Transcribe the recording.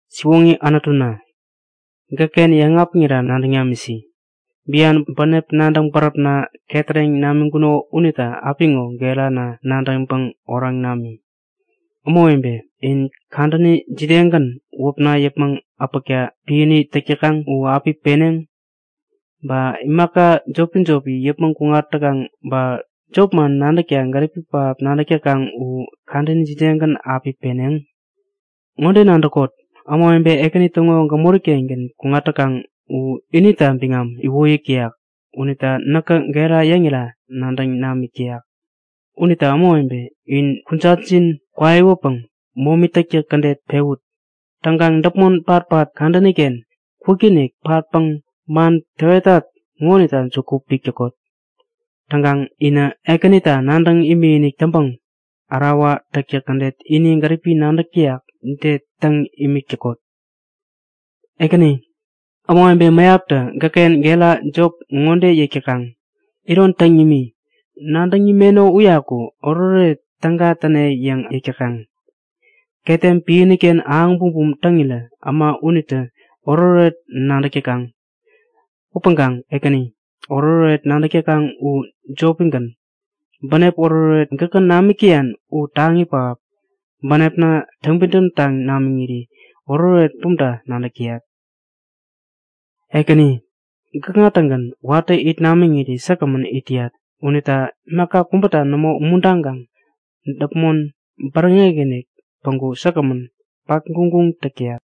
Siwoŋi Anutuna, gäkken yäŋapiŋira nadäŋ namisi. Bian bänep nadäŋ bäräpna ketäreŋ namiŋkuno unita apiŋo gerana nadäŋpäŋ oraŋ nami. Ämawebe, in kadäni jidegän wäpna yäpmäŋ äpäkta piäni täk täkaŋ u api peneŋ? Ba imaka jopi-jopi yäpmäŋ kuŋat täkaŋ ba jopman nadäkta gäripi pähap nadäk täkaŋ u kadäni jidegän api peneŋ? Ŋode nadäkot; Ämawebe Ekäni täŋo gämoriken kuŋat täkaŋ u inita biŋam iwoyäk täyak. Unita näkä gera yäŋira nadäŋ namik täyak. Unita ämawebe, in kujatjin kwaiwäpäŋ momi täktäk kädet pewut. Täŋkaŋ däpmon patpat kadäniken kwikinik patpäŋ man täwetat ŋonita juku pik täkot. Täŋkaŋ inä Ekänita nadäŋ imikinik täŋpäŋ ärawa täktäk kädet ini gäripi nadäk täyak ude täŋ imik täkot. Ekäni, ämawebe mäyaptä gäkken gera jop ŋode yäk täkaŋ; Iron täŋ nimi! Nadäŋ nimeno uyaku oretoret täga täne yäŋ yäk täkaŋ. Ketem piäniken ahäŋ bumbum täŋirä äma unitä oretoret nadäk täkaŋ. Upäŋkaŋ Ekäni, oretoret nadäk täkaŋ u jopigän. Bänep oretoret gäkä namik täyan u taŋi pähap. Bänepna täŋpidäm taŋ namiŋiri oretoret bumta nadäk täyat. Ekäni gäkŋa-tägän watä it namiŋiri säkgämän it täyat. Unita imaka kubäta nämo umuntaŋkaŋ däpmon bäräŋek-inik päŋku säkgämän patguŋguŋ täk täyat.